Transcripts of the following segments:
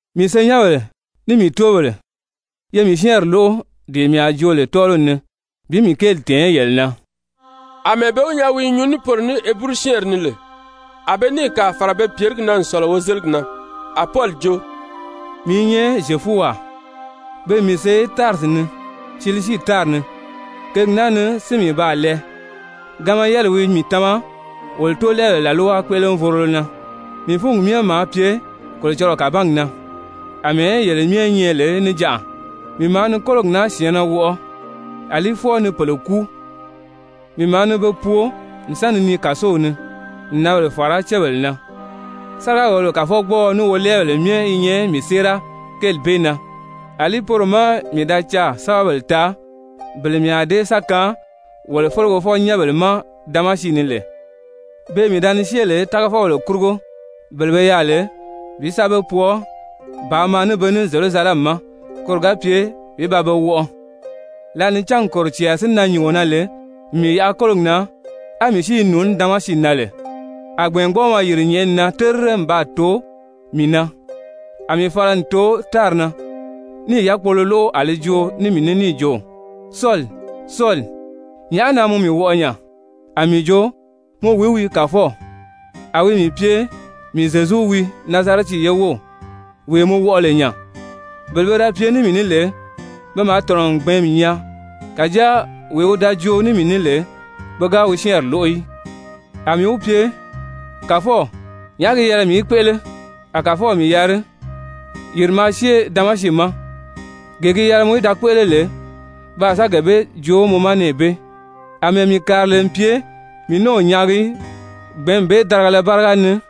«Mii senyɛnbèle, ní mii tóobèle, ye mii syɛ́ɛnri lóʔo dee mii a joo lè tɔ́ɔliw ni bi mii kéeli tɛ̀ɛn yele na.» Amɛɛ be wi nyaa wi i nyuu ní poro ní Heburu-syɛ́ɛnri ni lè, a be níì kàa fàra be pyèrigi na n sɔ̀lɔ wozeligi na. A Pɔli jo: «Mii i nyɛ Zyefuwaa, pe n mii see Tarisi ni, Silisii tári ni. Kěgi naa si ni mii baa lɛɛ, Gamaliyɛliwi mii tama wolo tóolɛɛbèle làlwa kpéʔelevorolo na. Mii fúngi myɛ maa pye Kolocɔlɔɔ kàbangi na àmɛɛ yele myɛ nyɛ lè níjanʔa. Mii maa ni kólogi naa syɛ̀ɛnnɛ wɔʔɔ àlí fwɔɔ ni pèle kúu, mii maa ni be pwoo n sa ni nii kàsow ni, n nǎnbèle fàra cébèle na. Sáriga-wòlobèle kàfɔgbɔɔɔ ní wolɛɛbèle myɛ i nyɛ mii séera kéeli bee na. Alí poro má mii da caà sɛ́bɛbèle taa, bele mii a dée sa kaan wolo felegefɔ-nyɛ́nbèle ma Damasi ni lè, beè mii da ni syée lè tágafɔbèle kurugo bele be yaà lè bi sa be pwɔɔ bàā maa ní be ní Zyerusalɛmi ma koro ga pye bi ba be wɔʔɔ.» «Lǎli ni cángi kòro cɛɛri si nan nyùngo na lè n mii yaʔa kólogi na, á mii si i nùuní Damasi na lè, a gbɛ̀ɛngbɔɔmɔ yìri nyɛ̀ʔɛni na terire n baa too mii na. A mii fala n too tári na, níì yákpolo lóʔo, a li joo ní mii ní níì jo: ‹Sɔli, Sɔli, nyàʔá na mɔ mii wɔʔɔ nya?› A mii jo: ‹Mɔ wìí wii, Kàfɔw?› A wi mii pye: ‹Mii Zyezu wii, Nazarɛti ye wów, wee mɔ wɔʔɔ lè nya.› Bele pe da pye ní mii ní lè, pe maa tɔ̀nɔ n gbɛ̀ɛ́nmi nyaa, kàjáa wee wi da joo ní mii ní lè, pe ga wi syɛ́ɛnri lóʔo í. A mii wi pye: ‹Kàfɔw, nyàʔá gi yɛlɛ mii í kpéʔele?› A Kàfɔw mii yari: ‹Yìri maa syée Damasi ma, gee gi yɛlɛ mɔ í da kpéʔele lè, pe a sa gee bee joo mɔ ma nɛɛ bee.› Amɛɛ mii kàri lè n pye mii ní o nyaagi í gbɛ̀ɛ́nmi bee darigala báriga ni,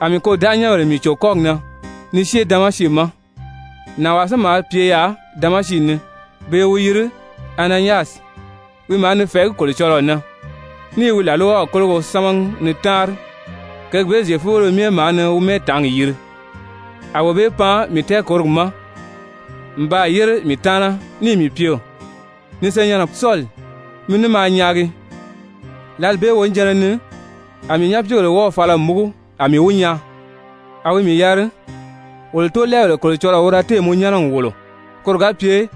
a mii kôdanʔanyɛnbèle mii cò kɔ́gi na ni syée Damasi ma. Nànwaa si maa pye yaà Damasi ni pe i wi yiri Ananyasi, wi maa ni fɛ̀ɛgí Kolocɔlɔɔ na ní i wi làlwaw kólogo sámagi ni táanri, kěgi bee Zyefubéle myɛ maa ni wi mɛ́ɛtaangi yiri, a wee bee pan mii tɛɛkòrogi ma n baa yére mii taana níì mii pye: ‹Ni senyɛnnɛ Sɔli, mi ní maa nyaagi.› Lǎli bee wonijanna ni a mii nyapiigèle wɔ́ɔ̀ fala n múgu a mii wi nyaa. A wi mii yari: ‹Wolo tóolɛɛbèle Kolocɔlɔɔ wi da téè mɔ nyɛ́nɛ n wòlo koro ga pye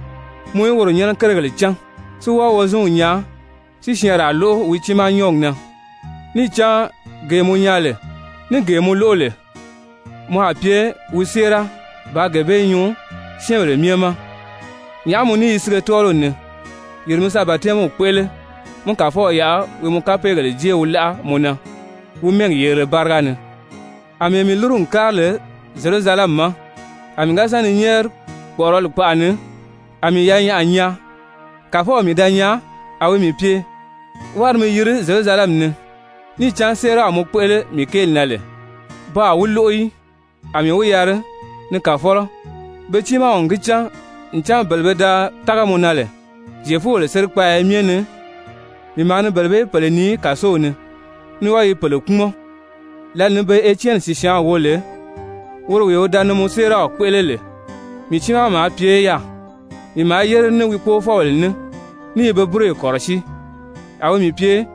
mɔ í woro nyɛ́nɛ kérigèle cán, si wɔ́ɔ Wozinw nyaa, si syɛɛnraa lóʔo wi tiimaa nyɔ́ɔgi na. Níì cán gee mɔ nyaa lè ní gee mɔ lóʔo lè, mɔ a pye wi séera bàā gee bee nyuu syɛ́ɛnbèle myɛ ma. Nyàʔá mɔ ní i sige tɔ́ɔliw ni? Yìri mi sa batɛmiw kpéʔele, mí Kàfɔw yaʔa wi mɔ kapeegèle jée wi láʔa mɔ na wi mɛ́ɛgi yerile báriga ni.›» Amɛɛ mii lúru n kári lè Zyerusalɛmi ma, a mii ga sa ni nyɛ́ɛri kpɔ̀ʔɔrɔli kpaʔa ni, a mii yanyaʔa nyaa, Kàfɔw mii da nyaa, a wi mii pye: ‹Wári mi yiri Zyerusalɛmi ni, níì cán séeraw mɔ kpéʔele mii kéeli na lè, pe a wi lóʔo í.› A mii wi yari: ‹Ni Kàfɔlɔ, pe tiimaw n gi cán ncan bele pe da tága mɔ na lè Zyefubèle sérikpaaya myɛ ni, mii maa ni bele bee pèle nii kàsow ni, ní wɔ́ɔ i bele kpúmɔn. Lǎli ni be Etyɛni sìsyaanw wo lè, woro wee wi da ni mɔ séeraw kpéʔele lè, mii tiimaa maa pye yaà, mii maa yére ní wi kpóofɔbèle ní, ní i be búroyi kɔ̀rɔsíi.› A wi mii pye: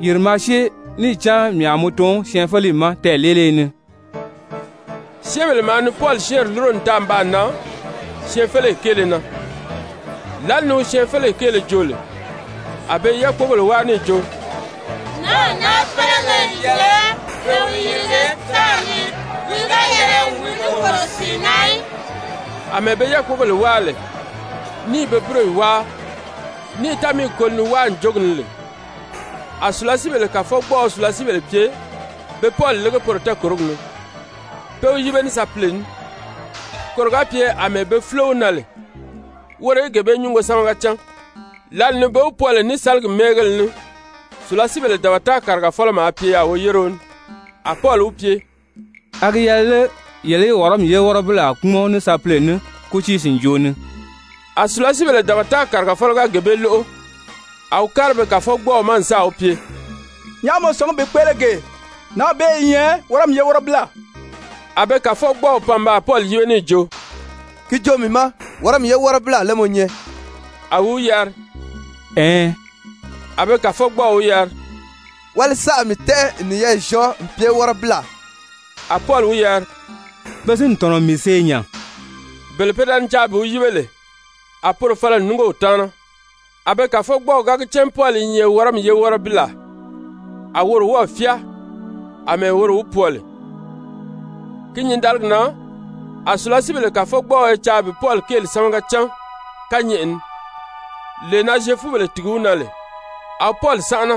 ‹Yìri maa syée, níì cán mii a mɔ tun syɛɛnfeleyi ma tɛɛ̀leeliye ni.›» Syɛ́ɛnbèle maa ni Pɔli syɛ́ɛnri lúro n taa n baa nan syɛɛnfeleyi kéele na. Lǎli ni wi syɛɛnfeleyi kéele joo lè, a be i yákpogèle wáa níì jo: «Nǎnw naa félege n yɛlɛ pe wi yirige tári ni! Wi ga yɛlɛ wi ní kòro sìi na í!» Amɛɛ be yákpogèle wáa lè, ní i be búroyi wáa, ní i támiigi koli ni wáa ǹjogi ni lè, a sùlasiibèle kàfɔgbɔɔɔ sùlasiibèle pye be Pɔli lége poro tɛɛkòrogi ni, pé wi yíbe ní sapile ní, koro ga pye àmɛɛ be fúlo wi na lè, woro í gee bee nyúngo sámaga cán. Lǎli ni be wi pwɔɔ lè ní sáligi mɛ́ɛngéle ní, sùlasiibèle dabata kàrigafɔlɔ maa pye yaà woyéreo ní, a Pɔli wi pye: «A gi yɛlɛ lé yele í Wɔrɔmi ye wɔ́rɔbilaa kpúmɔn ní sapile ní kútii sìnjoo ni?» A sùlasiibèle dabata kàrigafɔlɔ ga dee bee lóʔo, a wi kári be kàfɔgbɔɔw ma n sáà wi pye: «Nyàʔá mɔ sɔ̀ngí bi kpéʔele gee? Nǎnw bee i nyɛ Wɔrɔmi ye wɔ́rɔbilaa.» A be kàfɔgbɔɔw pan n baa Pɔli yíbe níì jo: «Ki joo mii ma, Wɔrɔmi ye wɔ́rɔbilaa lé mɔ nyɛ?» A wi wi yari «Ɛɛn.» A be kàfɔgbɔɔw wi yari: «Wáli saʔa mii tɛ́ʔɛ n niyɛɛ zyɔɔ n pye wɔ́rɔbilaa.» A Pɔli wi yari: «Pe si n tɔ̀nɔ n mii see nya.» Bele pe da ni caa bi wi yíbe lè, a poro fala n núngo wi taana, a be kàfɔgbɔɔw ga gi cán Pɔli i nyɛ Wɔrɔmi ye wɔ́rɔbilaa, a woro wɔ́ɔ̀ fyáa àmɛɛ woro wi pwɔɔ lè. Ki nyǐndaligi na a sùlasiibèle kàfɔgbɔɔɔ i caa bi Pɔli kéeli sámaga cán kányɛʔɛ ni, lee na Zyefubèle tìgi wi na lè. A wi Pɔli sánʔana,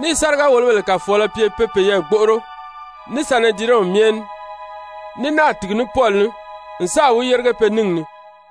níì sáriga-wòlobèle kàfɔɔlɔ pye pe peyɛɛ gbóʔoro ní Sanedirɛnw myɛ ní, ní náà tìgi ní Pɔli ní n sáà wi yérige pe níngi ni.